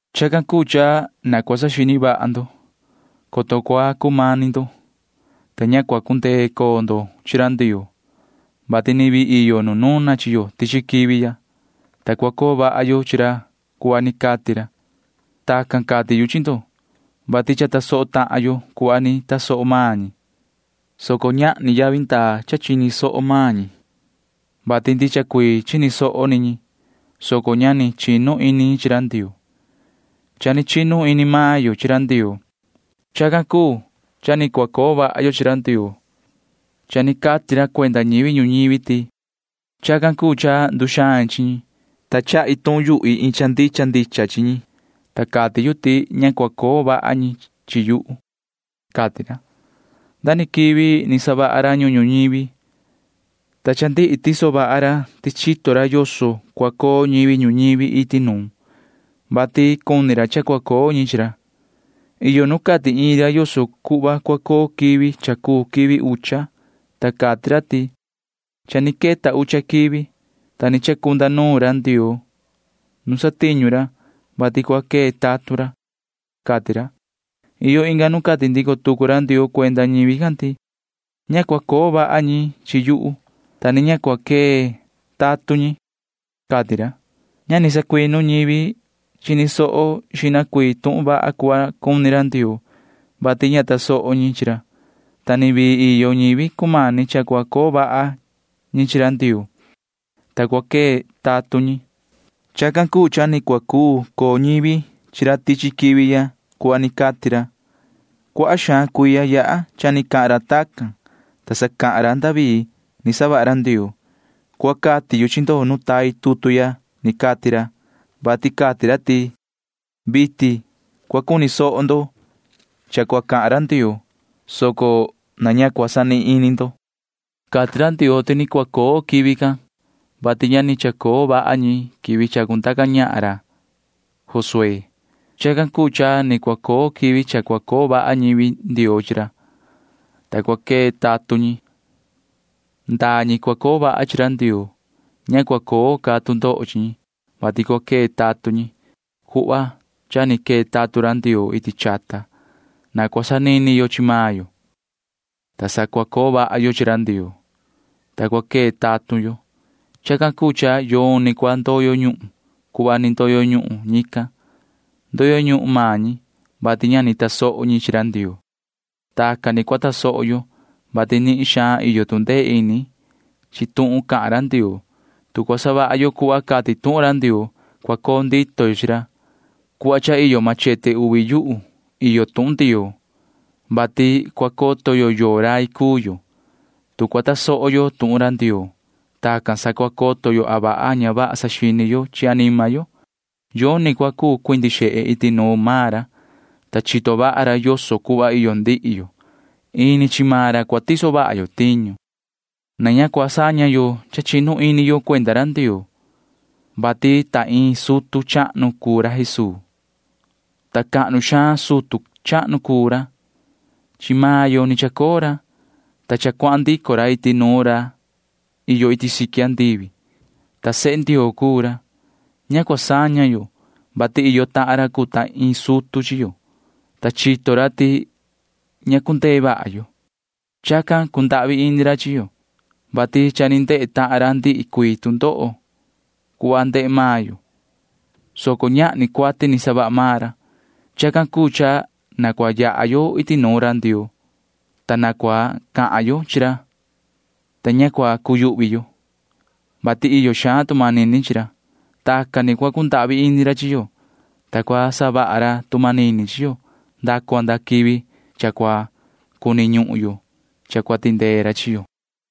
Chacan cuu cha na cua saxini vaha ndo, coto cua cumani ndo, ta ña cua cundee coo ndo chi ra Ndioo, vati ni vii iyo nu nuna chi yo tichi quivi ya, ta cua coo vaha yo chi ra cuhva ni cati ra. Tacan cati yu chi ndo, vati cha tasoho tahan yo cuhva ni tasoho maan ñi, soco ñahni yavi ndaa cha chini soho maan ñi, vati ndicha cuii chini soho ni ñi, soco ña ni chinu ini ñi chi ra Ndioo. Cha ni chinu ini maan yo chi ra Ndioo. Chacan cuu cha ni cua coo vaha yo chi ra Ndioo. Cha ni cati ra cuenda ñivi ñuñivi ti: Chacan cuu cha nduxain chi ñi, ta cahan rai yu iin cha ndicha ndicha chi ñi, ta cati yu ti ña cua coo vaha ñi chi yuhu, cati ra. Nda ni quivi ni savaha ra ñuhun ñuñivi, ta cha ndihi tiso vaha ra ti chito ra yoso cua coo ñivi ñuñivi iti nuun, vati cuni ra cha cua coo ñi chi ra. Iyo nu cati iin ra yoso cuhva cua coo quivi cha cuu quivi ucha, ta cati ra ti: Cha ni queta ucha quivi, ta ni chacunda nuun ra Ndioo nu satiñu ra, vati cua quee tatun ra, cati ra. Iyo inga nu cati ndico tucu ra Ndioo cuenda ñivi can ti: Ña cua coo vaha ñi chi yuhu, [ta ni ña cua quee tatun ñi,] cati ra. Ña ni sacuinu ñivi chini soho xihna tuhun vaha cuhva cuni ra Ndioo, vati ña tasoho ñi chi ra, ta ni vii iyo ñivi cumani cha cua coo vaha ñi chi ra Ndioo, [ta cua quee tatun ñi]. Chacan cuu cha ni cua cuu coo ñivi chi ra tichi quivi ya cuhva ni cati ra. Cuaha xaan cuiya yaha cha ni cahan ra tacan, ta sa cahan ra David ni savaha ra Ndioo. Cuhva cati yu chi ndo nu tai tutu ya ni cati ra, vati cati ra ti: Vitin cua cuni soho ndo cha cua cahan ra Ndioo, soco na ña cua sanihin ini ndo. Cati ra Ndioo ti ni cua coo quivi can, vati ña ni chacoo vaha ñi quivi chacundaca ñahan ra Josué. Chacan cuu cha ni cua coo quivi cha cua coo vaha ñivi Ndioo chi ra, ta cua quee tatun ñi. Ndaa ñi cua coo vaha chi ra Ndioo―ña cua coo ca tu ndoho chi ñi, [vati cua quee tatun ñi] cuhva cha ni quee tatun ra Ndioo iti chata. Na cua sanini yo chi maan yo, ta sa cua coo vaha yo chi ra Ndioo, ta cua quee tatun yo. Chacan cuu cha yoni cua ndoyo ñuhun cuhva ni ndoyo ñuhun ñican. Ndoyo ñuhun maan ñi, vati ña ni tasoho ñi chi ra Ndioo. Tacan ni cua tasoho yo, vati nihin xaan iyo tu ndee ini chi tuhun cahan ra Ndioo. Tu cua savaha yo cuhva cati tuhun ra Ndioo, cua coo ndito yo chi ra. Cuhva cha iyo machete uvi yuhu iyo tuhun Ndioo, vati cua coto yo yoo ñivi cuu yo, tu cua tasoho yo tuhun ra Ndioo. Tacan sa cua coto yo a vaha a ña vaha saxini yo chi anima yo. Yoni cua cuu cuindi xehe iti nuun maan ra, ta chito vaha ra yoso cuhva iyo ndihi yo. Ini chi maan ra cua tiso vaha yo tiñu. Na ña cua saña yo cha chinu ini yo cuenda ra Ndioo, vati ta iin sutu chahnu cuu ra Jesuu, ta cahnu xaan sutu chahnu cuu ra. Chi maan yo ni chacoo ra, ta cha cuahan ndico ra iti nuun ra iyo iti siqui andivi, ta sehe Ndioo cuu ra. Ña cua saña yo, vati iyo tahan ra cuu ta iin sutu chi yo, ta chito ra ti ña cundee vaha yo. Chacan cundahvi ini ra chi yo, vati cha ni ndehe tahan ra ndihi cuii tu ndoho cuhva ndehe maan yo, soco ñahni cuati ni savaha maan ra. Chacan cuu cha na cua yaha yo iti nuun ra Ndioo, ta na cua cahan yo chi ra, ta ña cua cuyuhvi yo, vati iyo xaan tu manini chi ra. Tacan ni cua cundahvi ini ra chi yo, ta cua savaha ra tu manini chi yo nda cua nda quivi cha cua cuni ñuhun yo cha cua tindee ra chi yo.